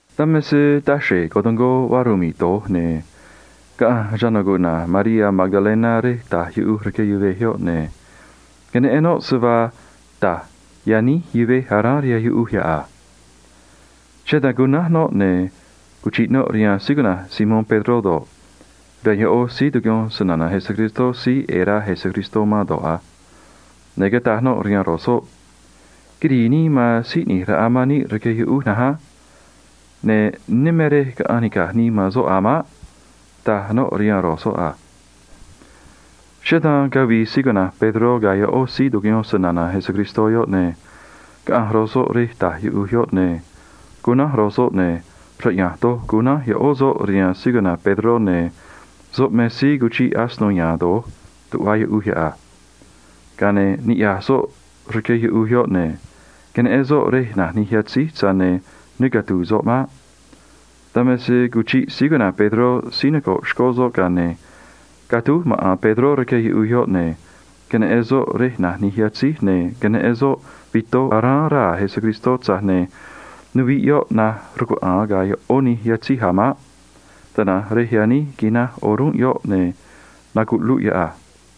Dan me se taxre̱j cotungó vaa rmi̱ꞌ doj, ne̱ caꞌanj chana̱ cuꞌna̱j Mariá Magdalena rej ta̱j yuꞌuj rque yuvej yoꞌ, ne̱ queneꞌen noꞌ se vaa ta̱j yaníj yuvej aráán rihaan yuꞌuj yoꞌ a. Cheꞌé dan cunánj noꞌ, ne̱ cuchiꞌ noꞌ rihaan síí cuꞌna̱j Simón Pedró do̱ꞌ, rihaan ꞌó síí tucuꞌyón snana̱ Jesús síí ꞌe̱e̱ rá Jesús man do̱ꞌ a. Ne̱ cataj noꞌ rihaan ro̱j soꞌ a: ―Quirii nii man Síí ꞌNi̱j Raꞌa man níꞌ rque yuꞌuj na̱nj á. Ne̱ ne neꞌen núj me rej caꞌanj nica̱j nii man soꞌ a̱ maꞌ ―taj noꞌ rihaan ro̱j soꞌ a. Cheꞌé dan cavii Pedró ga̱ ꞌó síí tucuꞌyón snana̱ Jesús yoꞌ, ne̱ caꞌanj ro̱j soꞌ rej ta̱j yuꞌuj yoꞌ a. Ne̱ cunánj ro̱j soꞌ, ne̱ yo̱o doj cunánj ꞌó soꞌ rihaan Pedró, ne̱ soꞌ me síí cuchiꞌ asino ya̱a̱n doj tuꞌva yuꞌuj yoꞌ a. Ga̱a ne̱ niꞌya̱j soꞌ rque yuꞌuj yoꞌ, ne̱ queneꞌen soꞌ rej na̱j nij yatzíj, tza̱j ne̱ ne catu̱u̱ soꞌ maꞌ. Dan me se cuchiꞌ Pedró síí noco̱ꞌ xcó soꞌ, ga̱a ne̱ catúj maꞌa̱n Pedró rque yuꞌuj yoꞌ, ne̱ queneꞌen soꞌ rej na̱j nij yatzíj a. Ne̱ queneꞌen soꞌ yatzíj aráán raa̱ Jesús, tza̱j ne̱ nuviꞌ yoꞌ naj rcuaꞌa̱a̱n ga̱ ꞌó nij yatzíj a̱ maꞌ. Tana̱nj rej yaníj quinaj o̱rúnꞌ yoꞌ, ne̱ nacuꞌluꞌ yoꞌ a.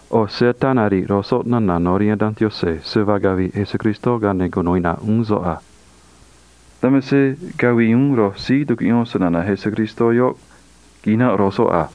ꞌO̱ se ataa nari̱ꞌ ro̱j soꞌ nana̱ no̱ rihaan Danj Yaꞌanj se vaa cavi̱ꞌ Jesús ga̱a ne̱ cunu̱u iꞌna̱ꞌ uún soꞌ a. Dan me se cavii uún ro̱j síí tucuꞌyón snana̱ Jesús yoꞌ, quinanꞌ ro̱j soꞌ a.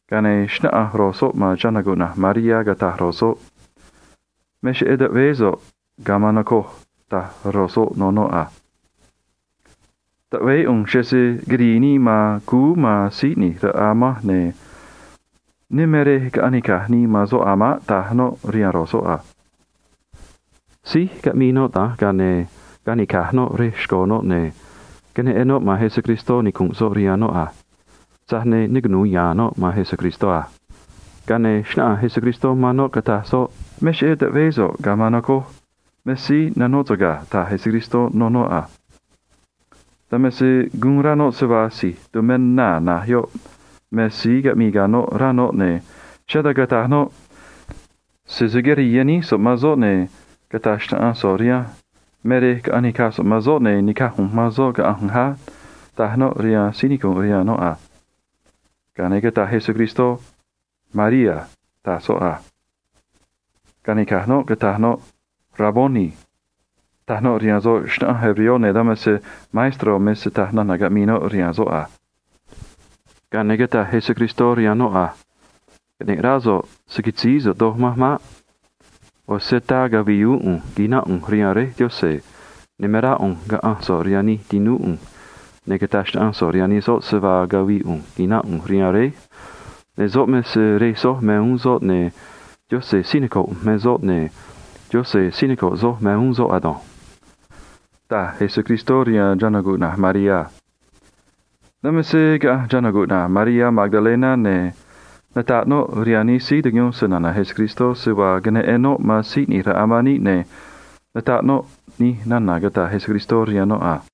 Ga̱a ne̱ xnáꞌanj ro̱j soꞌ man Mariá, cataj ro̱j soꞌ a: ―Me cheꞌé taꞌveé so̱ꞌ ga̱a maan, noco̱ꞌ ―taj ro̱j soꞌ rihaan noꞌ a. ―Taꞌveé ꞌu̱nj cheꞌé se quirii nii man cúú man Síí ꞌNi̱j Raꞌa manj, ne̱ ne me rej caꞌanj nica̱j nii man soꞌ a̱ maꞌ ―taj noꞌ rihaan ro̱j soꞌ a. Síj caꞌmii noꞌ da̱nj, ga̱a ne̱ canica̱j noꞌ rej xco̱ noꞌ, ne̱ queneꞌen noꞌ man Jesús, nicu̱nꞌ soꞌ rihaan noꞌ a. Tza̱j ne̱ ne cunu̱u ya̱a̱n noꞌ man Jesús maꞌ. Ga̱a ne̱ xnáꞌanj Jesús man noꞌ, cataj soꞌ a: ―Me cheꞌé taꞌveé so̱ꞌ ga̱a maan, noco̱ꞌ. Me síí nanóꞌ so̱ꞌ ga̱ ―taj Jesús rihaan noꞌ a. Dan me se guun rá noꞌ se vaa si̱j tumé naa̱ na̱j yoꞌ me síí caꞌmii ga̱ noꞌ, ne̱ cheꞌé dan cataj noꞌ a: ―Señor, sese quirii yaníj so̱ꞌ man soꞌ, ne̱ cata̱j xnaꞌanj so̱ꞌ rihanj me rej caꞌanj nica̱j so̱ꞌ man soꞌ, ne̱ ni̱caj ꞌu̱nj man soꞌ caꞌa̱nj ꞌu̱nj á ―taj noꞌ rihaan síí nicu̱nꞌ rihaan noꞌ a. Ga̱a ne̱ cataj Jesús a: ―María ―taj soꞌ a. Canica̱j noꞌ, cataj noꞌ a: ―Raboni ―taj noꞌ rihaan soꞌ, ne̱ dan me se maestró me raj cata̱a nana̱ caꞌmii noꞌ rihaan soꞌ a. Ga̱a ne̱ cataj Jesús rihaan noꞌ a: ―Caꞌne̱ꞌ rá so̱ꞌ, se̱ canó so̱ꞌ doj manj maꞌ. ꞌO̱ se ataa cavi̱i̱ uún ꞌu̱nj quina̱nꞌ ꞌu̱nj rihaan Réj Yaꞌanj, ne̱ me rá ꞌu̱nj caꞌa̱nj so̱ꞌ rihaan nij tinúú ꞌu̱nj a. Cata̱j xnaꞌanj so̱ꞌ rihaan nij soꞌ se vaa cavi̱i̱ ꞌu̱nj quina̱nꞌ ꞌu̱nj rihaan Réj, ne̱ soꞌ me Rej soj uún, ne̱ Yaꞌanj si̱j noco̱ꞌ ꞌu̱nj me soꞌ, ne̱ Yaꞌanj síí noco̱ꞌ soj me uún soꞌ ado̱nj ―taj Jesús rihaan Mariá a. Dan me se caꞌanj Mariá Magdalena, ne̱ nataꞌ noꞌ rihaan nij síí tucuꞌyón snana̱ Jesús se vaa queneꞌen noꞌ man Síí ꞌNi̱j Raꞌa man níꞌ, ne̱ nataꞌ noꞌ nij nana̱ cataj Jesús rihaan noꞌ a.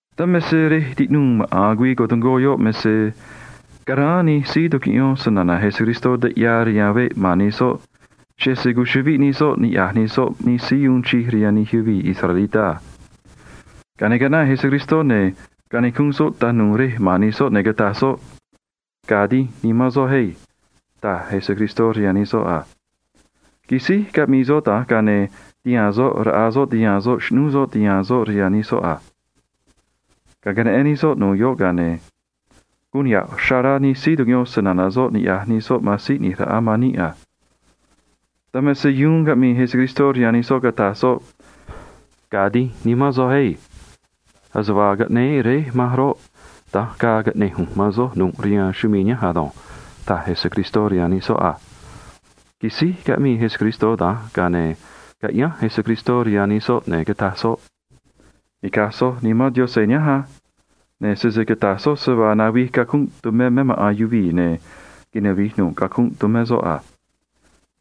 Dan me se rej tiꞌnuu maꞌa̱n güii cotungó yoꞌ me se caráán nij síí tucuꞌyón snana̱ Jesús nij taꞌyaa rihaan veꞌ ma̱n nij soꞌ, cheꞌé se cuchuꞌviꞌ nij soꞌ niꞌya̱j nij soꞌ nij síí uun chij rihaan nij yuvii̱ israelitá a. Ga̱a ne̱ caꞌnaꞌ Jesús, ne̱ canicunꞌ soꞌ tanu̱u̱ rej ma̱n nij soꞌ, ne̱ cataj soꞌ a: ―Ga̱a̱ dínj nimán soj á ―taj Jesús rihaan nij soꞌ a. Quisíj caꞌmii soꞌ da̱nj, ga̱a ne̱ tihaa̱n soꞌ raꞌa soꞌ tihaa̱n soꞌ xꞌnúú soꞌ tihaa̱n soꞌ rihaan nij soꞌ a. Ga̱a queneꞌen nij soꞌ nu̱ꞌ yoꞌ, ga̱a ne̱ guun niha̱ꞌ ya̱ rá nimán nij síí tucuꞌyón snana̱ soꞌ niꞌya̱j nij soꞌ man Síí ꞌNi̱j Raꞌa man níꞌ a. Dan me se caꞌmii uún Jesús rihaan nij soꞌ, cataj soꞌ a: ―Ga̱a̱ dínj nimán soj á. Ase vaa caꞌnéé Réj manj roꞌ, da̱nj ga̱a̱ caꞌne̱j ꞌu̱nj man soj ado̱nj ―taj Jesús rihaan nij soꞌ a. Quisíj caꞌmii Jesús da̱nj, ga̱a ne̱ caꞌyánj Jesús rihaan nij soꞌ, ne̱ cataj soꞌ a: ―Ni̱caj soj Nimán Yaꞌanj nihánj á. Ne̱ sese cata̱j soj se vaa navij cacunꞌ tumé me maꞌa̱n yuvii̱, ne̱ navi̱j nu̱ꞌ cacunꞌ tumé soꞌ a.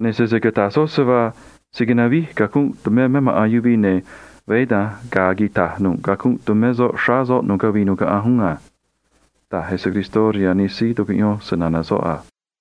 Ne̱ sese cata̱j soj se vaa se̱ navij cacunꞌ tumé me maꞌa̱n yuvii̱, ne̱ veé da̱nj ga̱a̱ quita̱j nu̱ꞌ cacunꞌ tumé soꞌ xráá soꞌ nu̱ꞌ cavii nu̱ꞌ caꞌanj uún a ―taj Jesús rihaan nij síí tucuꞌyón snana̱ soꞌ a.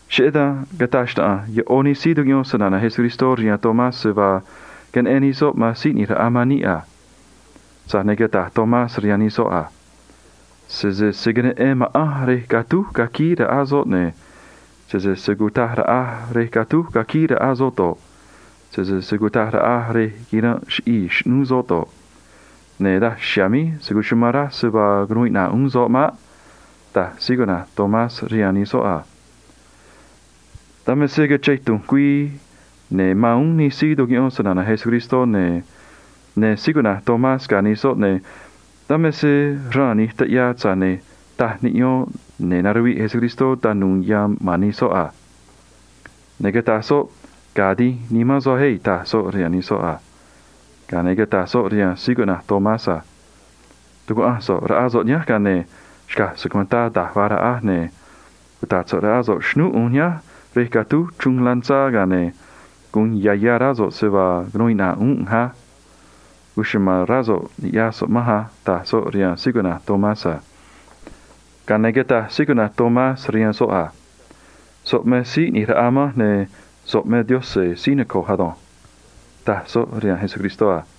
Cheꞌé dan cataj xnaꞌanj ꞌó nij síí tucuꞌyón snana̱ Jesús rihaan Tomás se vaa queneꞌen nij soꞌ man Síí ꞌNi̱j Raꞌa man níꞌ a. Tza̱j ne̱ cataj Tomás rihaan nij soꞌ a: ―Sese se̱ queneꞌen ma̱ꞌanj rej catúj caquíí raꞌa soꞌ, ne̱ sese se̱ cutaj raꞌaj rej catúj caquíí raꞌa soꞌ do̱ꞌ, sese se̱ cutaj raꞌaj rej quiranꞌ chiꞌii̱ xꞌnúú soꞌ do̱ꞌ, ne̱ daj chiha̱a̱ míj se̱ cuchumán raj se vaa cunuu iꞌna̱ꞌ uún soꞌ maꞌ ―taj Tomás rihaan nij soꞌ a. Dan me se cachén tu̱nj güii, ne̱ mán uún nij síí tucuꞌyón snana̱ Jesús, ne̱ ya̱nj Tomás ga̱ nij soꞌ a. Ne̱ dan me se xraan vaa nij taꞌyaa, tza̱j ne̱ ta̱j niꞌyo̱n, ne̱ naruviꞌ Jesús tanu̱u̱ yan ma̱n nij soꞌ a. Ne̱ cataj soꞌ a: ―Ga̱a̱ dínj nimán soj á ―taj soꞌ rihaan nij soꞌ a. Ga̱a ne̱ cataj soꞌ rihaan Tomás a: ―Tu̱cuaꞌanj so̱ꞌ raꞌá so̱ꞌ nihánj, ga̱a ne̱ xca̱j so̱ꞌ cuentá da̱j vaa raꞌaj, ne̱ cuta̱ꞌ so̱ꞌ raꞌá so̱ꞌ xꞌnúú ꞌu̱nj nihánj rej catúj chruun lanzá, ga̱a ne̱ gu̱un ya̱ ya̱ rá so̱ꞌ se vaa cunuu iꞌna̱ꞌ uún ꞌu̱nj á. Cuchuma̱n rá so̱ꞌ, ni̱ꞌyaj so̱ꞌ manj á ―taj soꞌ rihaan Tomás a. Ga̱a ne̱ cataj Tomás rihaan soꞌ a: ―So̱ꞌ me Síí ꞌNi̱j Raꞌa manj, ne̱ so̱ꞌ me Taꞌanj ꞌu̱nj ado̱nj ―taj soꞌ rihaan Jesús a.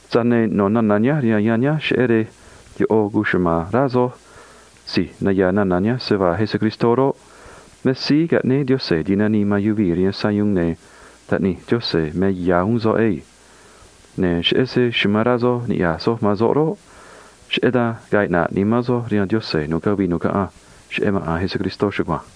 Tza̱j ne̱ no̱ nana̱ nihánj rihaan yanj nihánj cheꞌé rej ꞌo̱ cuchuma̱n rá soj si̱j naya̱a̱ nana̱ nihánj se vaa Jesús roꞌ, me Síí Caꞌnéé Yaꞌanj Ti̱nanii man Yuvii̱ rihaan Sayuun, ne̱ Taꞌníí Yaꞌanj me ya̱ uún soꞌ ado̱nj. Ne̱ cheꞌé se amán rá soj niꞌya̱j soj man soꞌ roꞌ, cheꞌé dan ga̱a̱ iꞌna̱ꞌ nimán soj rihaan Yaꞌanj nu̱ꞌ cavii nu̱ꞌ caꞌanj cheꞌé maꞌa̱n Jesús chugua̱nj.